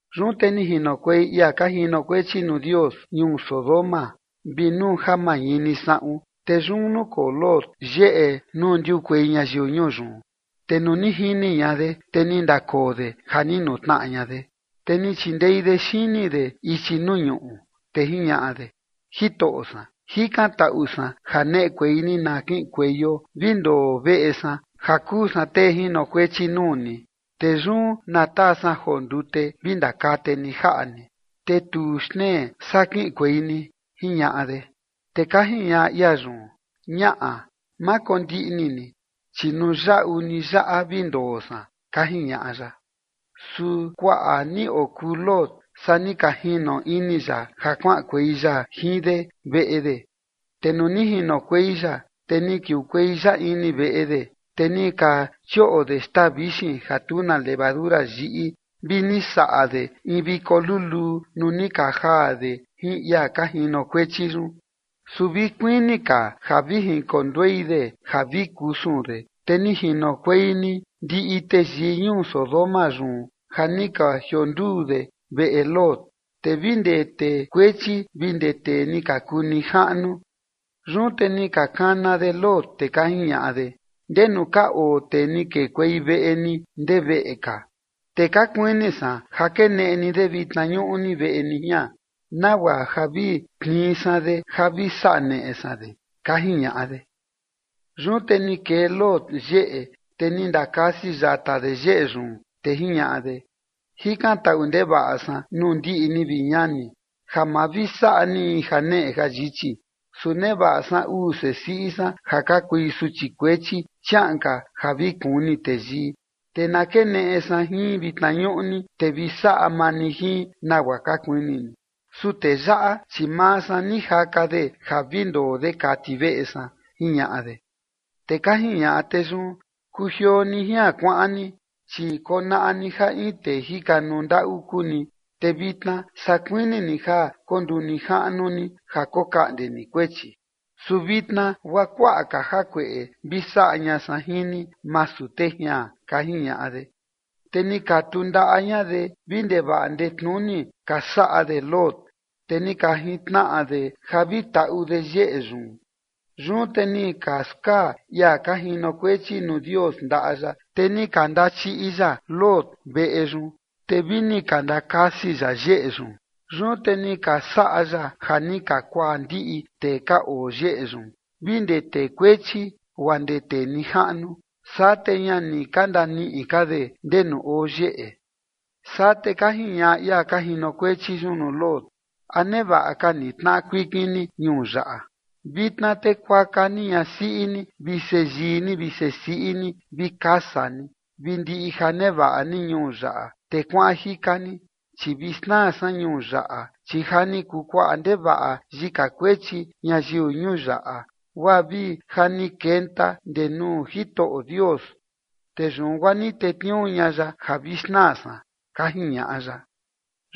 Yun te ni jinokuei ia ka jinokuechi nuu Dios ñuu Sodoma vi nuu ja mañini saꞌun, te yun nukoo Lot yeꞌe nuu ndiukuei ñayiu ñuu yun. Te nuu ni jini ña de, te ni ndakoo de ja ni nutnaꞌa ña de, te ni chindei de xini de ichi nuu ñuꞌu, te jiñaꞌa de: ―Jitoꞌo san, jikantaꞌu san ja neꞌekuei ni na kiꞌinkueio vi ndoo veꞌe san ja kuu san tee jinokuechi nuu ni, te yun na taa san joo ndute vi ndakate ni jaꞌa ni, te tuu xtnee saa kiꞌinkuei ni ―jiñaꞌa de. Te ka jiñaꞌa ia yun: ―Ñaꞌa, ma kondiꞌni ni, chi nuu yaꞌu ni yaꞌa vi ndoo san ―ka jiñaꞌa ya. Su kuaꞌa ni okuu Lot saa ni ka jino ini ya ja kuaꞌankuei ya jin de veꞌe de, te nuu ni jinokuei ya, te ni kiukuei ya ini veꞌe de, te ni ka chioꞌo de xtaa vixin ja tu na levadura yiꞌi vi ni saꞌa de in viko luluu nuu ni ka jaa de jin ia ka jinokuechi yun. Su vi kuini ka ja vi jinkonduei de ja vi kusun de, te ni jinokuei ni ndiꞌi teyii ñuu Sodoma yun ja ni ka jionduu de veꞌe Lot, te vi ndee tee kuechi vi ndee tee ni ka kuu nijaꞌnu. Yun te ni ka kana de Lot, te ka jiñaꞌa de: ―¿Ndenu ka oo tee ni kekuei veꞌe ni ndee veꞌe ka? Te ka kuini san ja keneꞌe ni de vitna ñuꞌni veꞌe ni jian, nagua ja vi tnii san de ja vi saꞌa neꞌe san de ―ka jiñaꞌa de. Yun te ni kee Lot yeꞌe, te ni ndakasi yata de yeꞌe yun. Te jiñaꞌa de: ―Jikantaꞌu ndevaꞌa san nuu ndiꞌi ni, vi ñani, ja ma vi saꞌa ni in janeꞌe jayichi. Su nevaꞌa san uu sesiꞌi san ja ka kui suchi kuechi chiaꞌan ka ja vi kuni teyii, te na keneꞌe san jin vitna ñuꞌni, te vi saꞌa maa ni jin nagua ka kuini ni. Su tee yaꞌa, chi maa san ni jaka de ja vi ndoo de kati veꞌe san ―jiñaꞌa de. Te ka jiñaꞌa tee yun: ―Kujioo ni jian kuaꞌan ni, chi konaꞌa ni ja in tee jikanuu ndaꞌu kuu ni, te vitna saa kuini ni ja konduu nijaꞌnu ni ja kokaꞌnde ni kuechi. Su vitna guaa kuaꞌa ka jakueꞌe vi saꞌa ña san jin ni masu tee jian ―ka jiñaꞌa de. Te ni ka tundaꞌa ña de vi ndevaꞌa ndetnuni ka saꞌa de Lot, te ni ka jintnaꞌa de ja vi taꞌu de yeꞌe yun. Yun te ni ka skaa ia ka jinokuechi nuu Dios ndaꞌa ya, te ni ka ndachiꞌi ya Lot veꞌe yun, te vini ni ka ndakasi ya yeꞌe yun. Yun te ni ka saꞌa ya ja ni ka kuaa ndiꞌi tee ka oo yeꞌe yun vi ndee tee kuechi guaa ndee tee nijaꞌnu, saa te ña ni ka ndaniꞌi ka de ndenu oo yeꞌe. Saa te ka jiñaꞌa ia ka jinokuechi yun nuu Lot: ―¿A nevaꞌa ka ni tnaꞌa kuikin ni ñuu yaꞌa? Vitna te kuaka ni ñasiꞌi ni vi seyii ni vi sesiꞌi ni vi kasa ni vi ndiꞌi ja nevaꞌa ni ñuu yaꞌa, te kuaꞌan jika ni. Chi vi xnaa san ñuu yaꞌa, chi ja ni kuu kuaꞌa ndevaꞌa yika kuechi ñayiu ñuu yaꞌa, guaa vi ja ni kenta ndee nuu Jitoꞌo Dios, te yun guaa ni tetniuu ña ya ja vi xnaa san ―ka jiñaꞌa ya.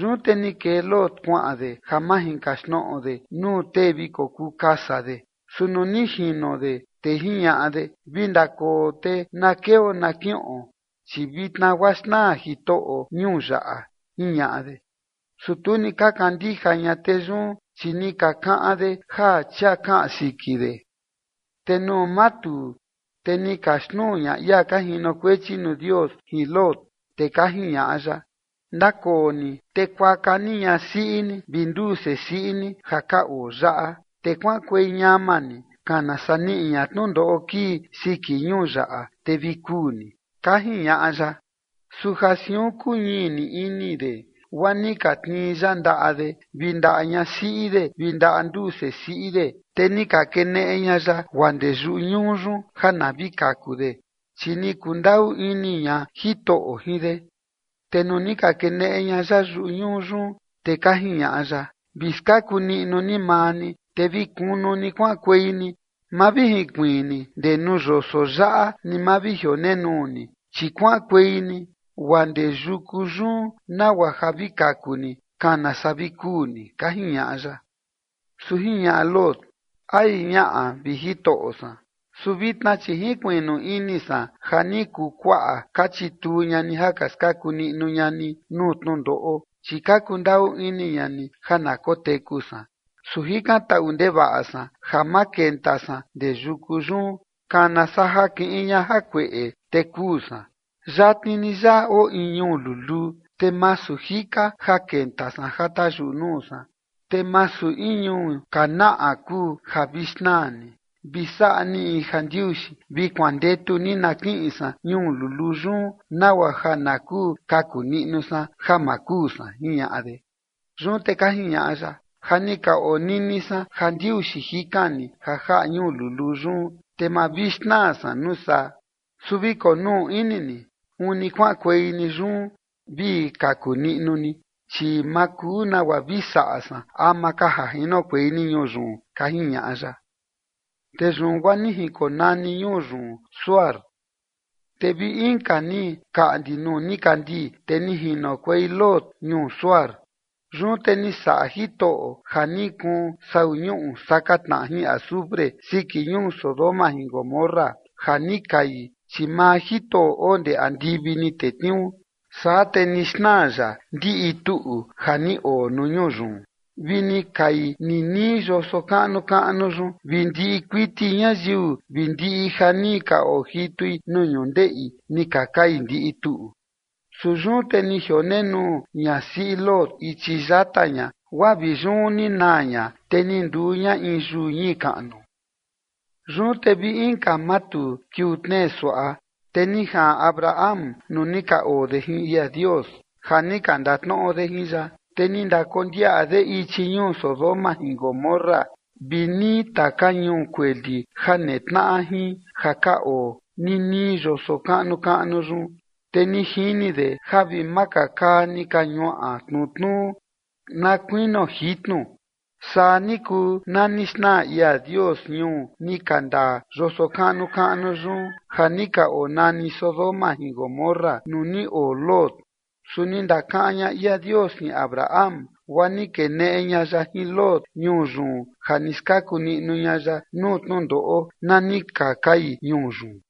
Yun te ni kee Lot kuaꞌan de ja majinkaxtnoꞌo de nuu tee vi kokuu kasa de. Su nuu ni jino de, te jiñaꞌa de: ―Vi ndakoo te na keo na kiꞌon, chi vitna guaa xnaa Jitoꞌo ñuu yaꞌa ―jiñaꞌa de. Su tu ni ka kandija ña tee yun, chi ni ka kaꞌan de ja chia kaꞌan siki de. Te nuu matuu, te ni ka xnuu ña ia ka jinokuechi nuu Dios jin Lot, te ka jiñaꞌa ya: ―Ndakoo ni te kuaka ni ñasiꞌi ni vi nduu sesiꞌi ni ja ka oo yaꞌa, te kuaꞌankuei ñama ni kana saa niꞌi ña tnundoꞌo kii siki ñuu yaꞌa, te vi kuu ni ―ka jiñaꞌa ya. Su ja siun kuñii ni ini de guaa ni ka tnii ya ndaꞌa de vi ndaꞌa ñasiꞌi de vi ndaꞌa nduu sesiꞌi de, te ni ka keneꞌe ña ya guaa ndee yuñuu yun ja na vi kaku de, chi ni kundaꞌu ini ña Jitoꞌo jin de. Te nuu ni ka keneꞌe ña ya yuñuu yun, te ka jiñaꞌa ya: ―Vi skaku niꞌnu ni maa ni, te vi kunu ni kuaꞌankuei ni ma vi jinkuiin ni ndee nuu yoso yaꞌa ni ma vi jionenuu ni, chi kuaꞌankuei ni guaa ndee yuku yun nagua ja vi kaku ni, kana saa vi kuu ni ―ka jiñaꞌa ya. Su jiñaꞌa Lot: ―Ai, ñaꞌa, vi Jitoꞌo san. Su vitna chi jinkuiꞌnu ini san ja ni kuu kuaꞌa ka chituu ña ni ja ka skaku niꞌnu ña ni nuu tnundoꞌo, chi ka kundaꞌu ini ña ni ja na koteku san. Su jikantaꞌu ndevaꞌa san ja ma kenta san ndee yuku yun, kana saa ja kiꞌin ña jakueꞌe, te kuu san. Yatni ni yaꞌa oo in ñuu luluu, te masu jika ja kenta san ja tayuꞌu nuu san, te masu in ñuu kanaꞌa kuu ja vi xnaa ni. Vi saꞌa ni jandiuxi vi kuandetu ni na kiꞌin san ñuu luluu yun nagua ja na kuu kaku niꞌnu san ja ma kuu san ―jiñaꞌa de. Yun te ka jiñaꞌa ya: ―Ja ni ka onini san jandiuxi jikan ni ja jaꞌa ñuu luluu yun, te ma vi xnaa san nuu saa. Su vi konuu ini ni uni kuaꞌankuei ni yun vi kaku niꞌnu ni, chi ma kuu nagua vi saꞌa san ama ka ja jinokuei ni ñuu yun ―ka jiñaꞌa ya. Te yun guaa ni jinkonani ñuu yun Zoar. Te vi inka ni kaꞌndi nuu nikandii, te ni jinokuei Lot ñuu Zoar. Yun te ni saꞌa Jitoꞌo ja ni kuun sau ñuꞌu saka tnaꞌa jin azufre siki ñuu Sodoma jin Gomorra ja ni kai, chi maa Jitoꞌo oo ndee andivi ni tetniuu. Saa te ni xnaa ya ndiꞌi tuꞌu ja ni oo nuu ñuu yun vi ni kai ninii yoso kaꞌnu kaꞌnu yun vi ndiꞌi kuiti ñayiu vi ndiꞌi ja ni ka ojitui nuu ñundeꞌi, ni ka kai ndiꞌi tuꞌu. Su yun te ni jionenuu ñasiꞌi Lot ichi yata ña guaa vi yun ni naa ña, te ni nduu ña in yuu ñii kaꞌnu. Yun te vi inka matuu kiuu tnee suaꞌa, te ni jaꞌan Abraham nuu ni ka oo de jin ia Dios ja ni ka ndatnoꞌo de jin ya. Te ni ndakondiaꞌa de ichi ñuu Sodoma jin Gomorra vi nii taka ñuu kueli ja netnaꞌa jin ja ka oo ninii yoso kaꞌnu kaꞌnu yun, te ni jini de ja vi makakaa ni ka ñuaꞌa tnutnuu na kuinio jitnu. Saa ni kuu na ni xnaa ia Dios ñuu ni ka ndaa yoso kaꞌnu kaꞌnu yun ja ni ka onani Sodoma jin Gomorra nuu ni oo Lot. Su ni ndakaꞌan ña ia Dios jin Abraham, guaa ni keneꞌe ña ya jin Lot ñuu yun ja ni skaku niꞌnu ña ya nuu tnundoꞌo na ni ka kai ñuu yun.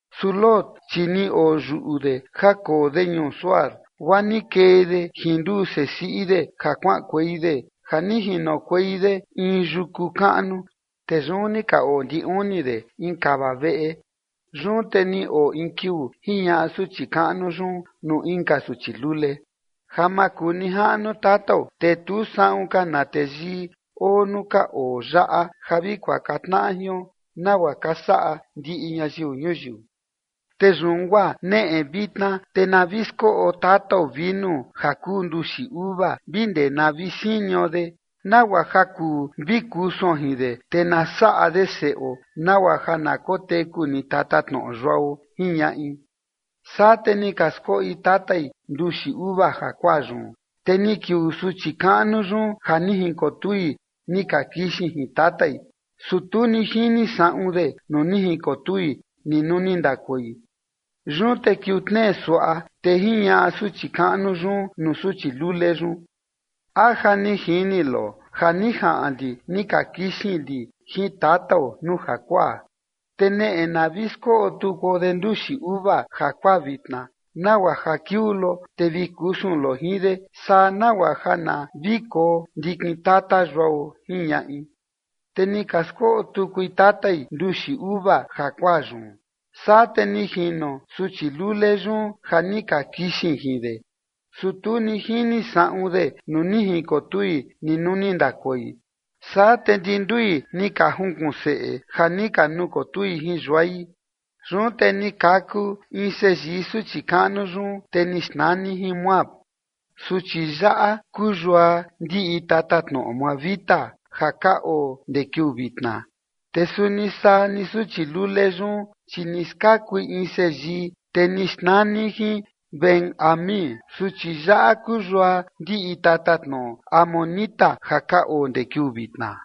Su Lot, chi ni oyuꞌu de ja koo de ñuu Zoar, guaa ni kee de jin nduu sesiꞌi de ja kuaꞌankuei de ja ni jinokuei de in yuku kaꞌnu, te yun ni ka oo ndi uni de in kava veꞌe. Yun te ni oo in kiuu jiñaꞌa suchi kaꞌnu yun nuu inka suchi lule: ―Ja makunijaꞌnu tatao, te tu saꞌun ka na teyii oo nuu ka oo yaꞌa ja vi kuaka tnaꞌa jion, nagua ka saꞌa ndiꞌi ñayiu ñuyiu. Te yun guaa neꞌe vitna, te na vi skoꞌo tatao vinu ja kuu nduxi uva vi ndee na vi sinio de, nagua ja kuu vi kusuon jin de, te na saꞌa de seꞌo nagua ja na koteku ni tatatnoꞌo yuao ―jiñaꞌi. Saa te ni ka skoꞌi tatai nduxi uva jakuaa yun, te ni kiuu suchi kaꞌnu yun ja ni jinkotui ni ka kixin jin tatai, su tu ni jini saꞌun de nuu ni jinkotui ni nuu ni ndakoi. Yun te kiuu tnee suaꞌa, te jiñaꞌa suchi kaꞌnu yun nuu suchi lule yun: ―A ja ni jini lo ja ni jaꞌan li ni ka kixin li jin tatao nuu jakuaa. Te neꞌe na vi skoꞌo tukuo de nduxi uva jakuaa vitna nagua ja kiuu lo, te vi kusun lo jin de, saa nagua ja na vi koo ndikin tata yuao ―jiñaꞌi. Te ni ka skoꞌo tukui tatai nduxi uva jakuaa yun, saa te ni jino suchi lule yun ja ni ka kixin jin de, su tu ni jini saꞌun de nuu ni jinkotui ni nuu ni ndakoi. Saa te ndi ndui ni ka junkuꞌun seꞌe ja ni ka nukotui jin yuai. Yun te ni kaku in seyii suchi kaꞌnu yun, te ni xnani jin Moab, suchi yaꞌa kuu yua ndiꞌi tatatnoꞌo moabita ja ka oo ndee kiuu vitna. Te suni saa ni suchi lule yun, chi ni skakui in seyii, te ni xnani jin Ben-ammi, suchi yaꞌa kuu yua ndiꞌi tatatnoꞌo amonita ja ka oo ndee kiuu vitna.